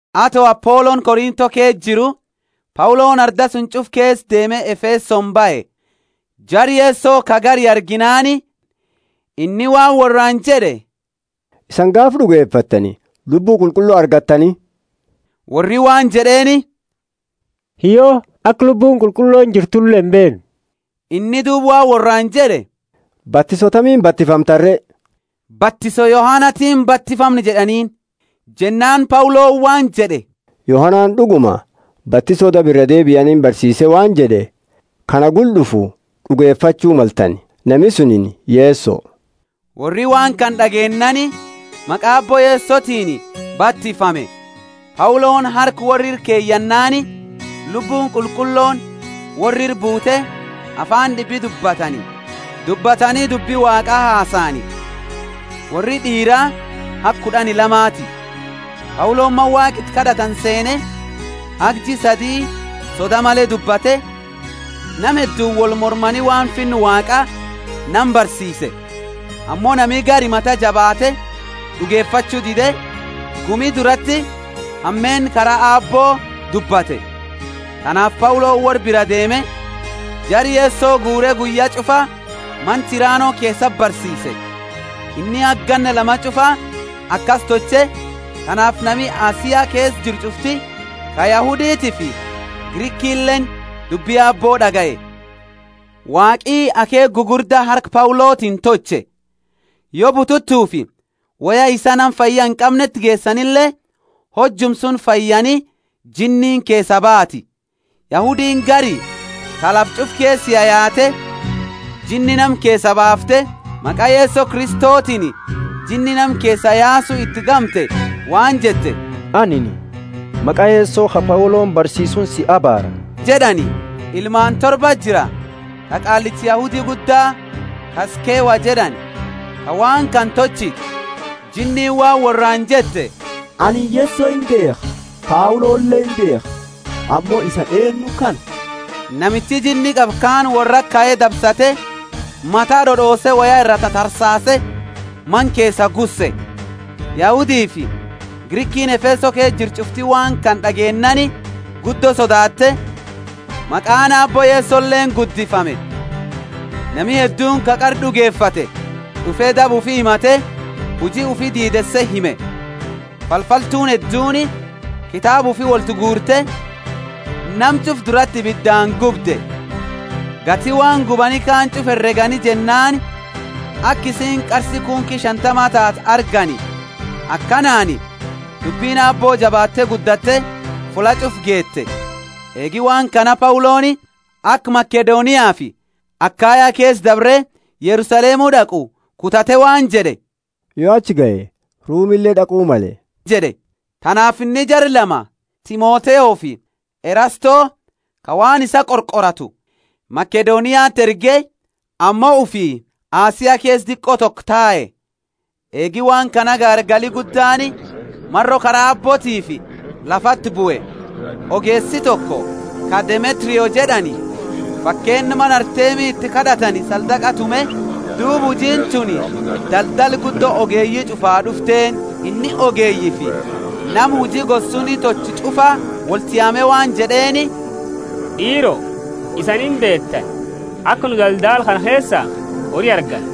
Ato Apoloni Korintho ke jiru, Pauloni arda suni ch'ufa keesa deeme Efesoni bahe. Jara Yeso ka gari arginaani inni waan worraani jed'e, Isani gaafa d'ugefattani Lubbu Qulqullo argattani? Worri waan jed'eeni, Hiyyo, aka Lubbuuni Qulqullooni jirtule imbeennu. Inni duuba waan worraani jed'e, Batiso tamiini batifamtani re? Batiso Yohanatiini batifamne jed'aniini. Jennaani Pauloni waan jed'e, Yohanani d'uguma batiso daba iraa deebianiini barsiise waan jed'e, Ka na gula d'ufu d'ugefachu maltani, nami suni Yeso. Worri waan kana d'ageennaani maqa Aabbo Yesotiini batifame. Pauloni harka worra ira keyanaani, Lubbuuni Qulqullooni worra ira buute afaani d'ibi dubbatani dubbi Waaqa hasani. Worri d'iira haga kud'ani lamati. Pauloni mana Waaqa iti kad'atani seene, haga jia sadi soda male dubbate, nama hedduuni wolmormani waan finna Waaqa nama barsiise. Ammo nami gari mata jabaate d'ugefachu dide, gumi durati hameenna kara Aabbo dubbate. Tanaafi Pauloni worra biraa deeme, jara Yeso guure guyya ch'ufa mana Tirano keesati barsiise. Inni haga ganna lama ch'ufa akasi tolche, tanaafi nami Asia keesa jiru ch'ufti, ka Yahuditiifi Grikileeni, dubbi Aabbo d'agaye. Waaqi akheekha gugurda harka Paulotiini tolche. Yo bututufi woya isaa nama fayya inqamneti geesanile, hojuma suni fayyani jinniini keesaa baati. Yahudiini gari, ta lafa ch'ufa keesa yayaate jinni nama keesaa baafte, maqa Yeso Kristotiini jinni nama keesa yaasu iti gamte waan jette, Anini maqa Yeso, ka Pauloni barsiisuuni si abaara jed'ani. Ilmaani torbati jira, ta Qaallicha Yahudi Gudda, ka Skewa jed'ani, ta waan kana tolchite. Jinniini waan worraani jette, Anini Yeso imbeekha, Paulole imbeekha, ammo isani eennu kana? Namichi jinni qabu kaani worrati kae dabsate, mata d'od'oose woya ira tatarsaase, mana keesaa gusse. Yahudifi Grikiini Efeso keesa jirtu ch'ufti waan kana d'ageennaani guddo sodaatte, maqaani Aabbo Yesoleeni guddifame. Nami hedduuni ka qara d'ugefate d'ufe daba ufi himate, huji ufi diideese hime. Falfaltuuni hedduuni kitaaba ufi wolti guurte, nama ch'ufa durati ibidaani gubde. Gati waan gubani kaani ch'ufa heregani jennaani aka isiini qarsi kunki shantama taate argani. Akanaani dubbini Aabbo jabaatte guddatte fulla ch'ufaa geete. Eegi waan kana Pauloni aka Makedoniafi Akaya keesa dabre Yerusalemu d'aqu kutate waan jed'e, Yo achi gahe, Rumile d'aqu male jed'e. Tanaafi inni jara lama, Timotheofi Erasto, ka waan isaa qorqoratu, Makedoniati erge, ammo ufi Asia keesa diqo toko tae. Eegi waan kana gaargali guddaani, maro Kara Aabbootiifi, lafati bue. Ogeesi toko, ka Demetrio jed'ani, fakeenna mana Artemi iti kad'atani saldaqa tume, duuba hujiini tuni daldala guddo ogeeyi ch'ufaa d'ufteeni. Inni ogeeyifi nama huji gosa suni tolchu ch'ufa wolti yaame waan jed'eeni, D'iiro, isani imbeetani, aka nu daldala kana keesa hori argannu.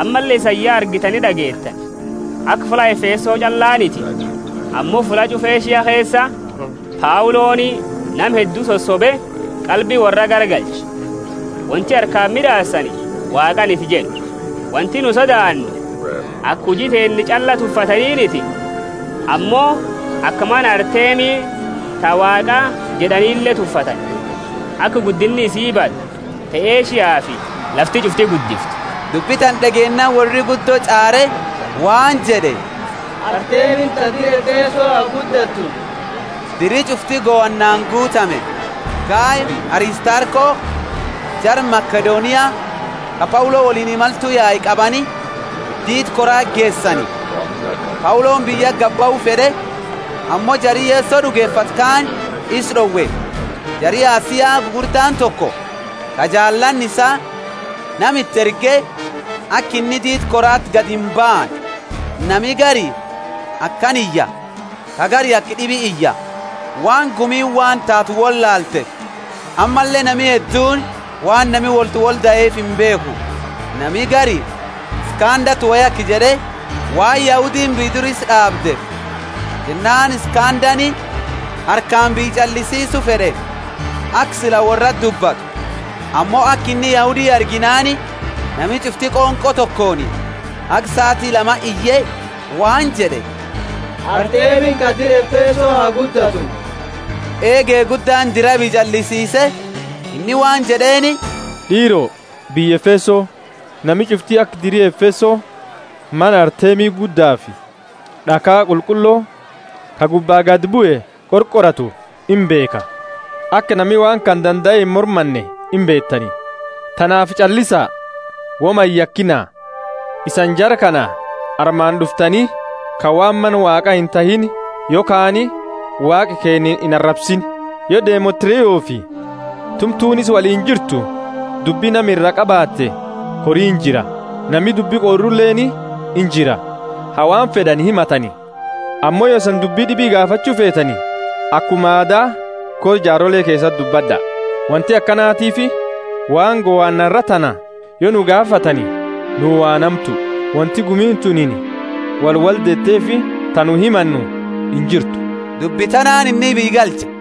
Ammalle isani ya argitani d'ageettani, aka fulla Efeso ch'allaaniti, ammo fulla ch'ufa Asia keesa, Pauloni nama heddu sosobe qalbi worra garagalche, Wonti harkaani mid'aasani Waaqaaniti jed'u. Wonti nu sodaannu aka huji teenna ch'alla tuffataniniti, ammo aka mana Artemi ta waaqa jed'anile tuffatani, aka guddinni isi badu, ta Asiafi lafti ch'ufti guddiftu! Dubbi tana d'ageennaani worri guddo ch'aare, waan jed'e, Artemini ta dira Efeso ha guddatu! Diri ch'ufti gohannaani guutame. Gayofi Aristarko, jara Makedonia, ka Paulo woliini imaltu yaani qabani, diida korati geesani. Pauloni biyyati gadi bahu fed'e, ammo jari Yeso d'ugefate kaani isa d'owe. Jari Asia gugurdaani toko, ka jaalaani isaa, nama iti erge, aka inni diida korati gadimbaane. Nami gari akana iya, ka gari aka d'ibi iya, waan gumiini waan taatu wolaalteefi; ammalle nami hedduuni waan nami woltiwoldaeefi imbeekhu. Nami gari, Iskandati wo yake jed'e, waan Yahudiini biyya dura isa d'aabdeefi. Jennaani Iskandani harkaani biyya ch'allisiisu fed'e, aka sila worrati dubbatu. Ammo aka inni Yahudi arginaani, nami ch'ufti qonqo tokooni haga saati lama iye, waan jed'e, Artemini ka dira Efeso ha guddatu! Eege guddaani dira biyya ch'allisiise, inni waan jed'eeni, D'iiro, biyya Efeso, nami ch'ufti aka diri Efeso mana Artemi guddafi d'akha qulqullo ka gubba gadi bue qorqoratu imbeekha. Aka nami waan kana dandae imormanne imbeetani, tanaafi ch'allisa, woma iyakina! Isani jara kana armati d'uftaniini, ka waan mana Waaqaa inhatiini, yokhaani waaqa keenna inarabsiini. Yo Demetriofi tumtuni isa woliini jirtu dubbi nama iraa qabaate kori injira nami dubbi qoruleeni injira, ha waan fed'ani himatani. Ammo yo isani dubbi d'ibi gaafachu feetani, akuma aada kora jaarole keesati dubbad'a. Wonti akanatiifi waan gohanna arra tana, yo nu gaafatani, nuu waan hamtu; wonti gumiini tunini wolwoldeeteefi, ta nu himannu, injirtu. Dubbi tanaani inni biyya galche.